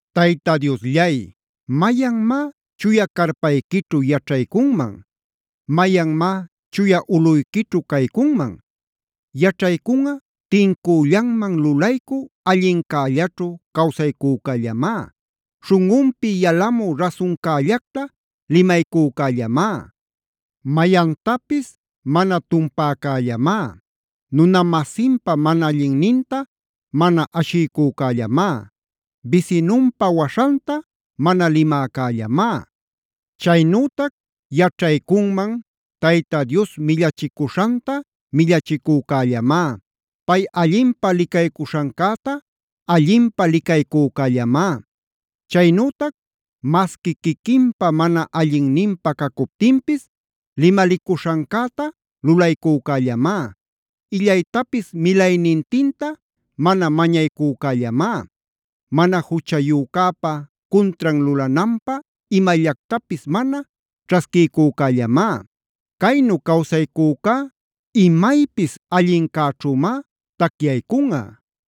Tayta Diosllay, ¿mayanmá chuya carpayquićhu yaćhaycunman? ¿Mayanmá chuya ulꞌuyquićhu caycunman? Yaćhaycunꞌa tincüllanman lulaycü allincällaćhu cawsaycücällamá,a śhunꞌunpi yalamü rasuncällacta limaycücällamá, mayantapis mana tumpäcällamá, nuna-masinpa mana allinninta mana ashiycücällamá, bisinunpa waśhanta mana limäcällamá. Chaynütac yaćhaycunman: Tayta Dios millachicuśhanta millachicücällamá, pay allinpä licaycuśhancäta allinpä licaycücällamá. Chaynütac masqui quiquinpa mana allinninpä cacuptinpis limalicuśhancäta lulaycücällamá, illaytapis milaynintinta mana mañaycücällamá, mana juchayücäpa cuntran lulananpä imallactapisb mana ćhasquiycücällamá. Caynu cawsaycücá imaypis allincäćhümá tacyaycunꞌa.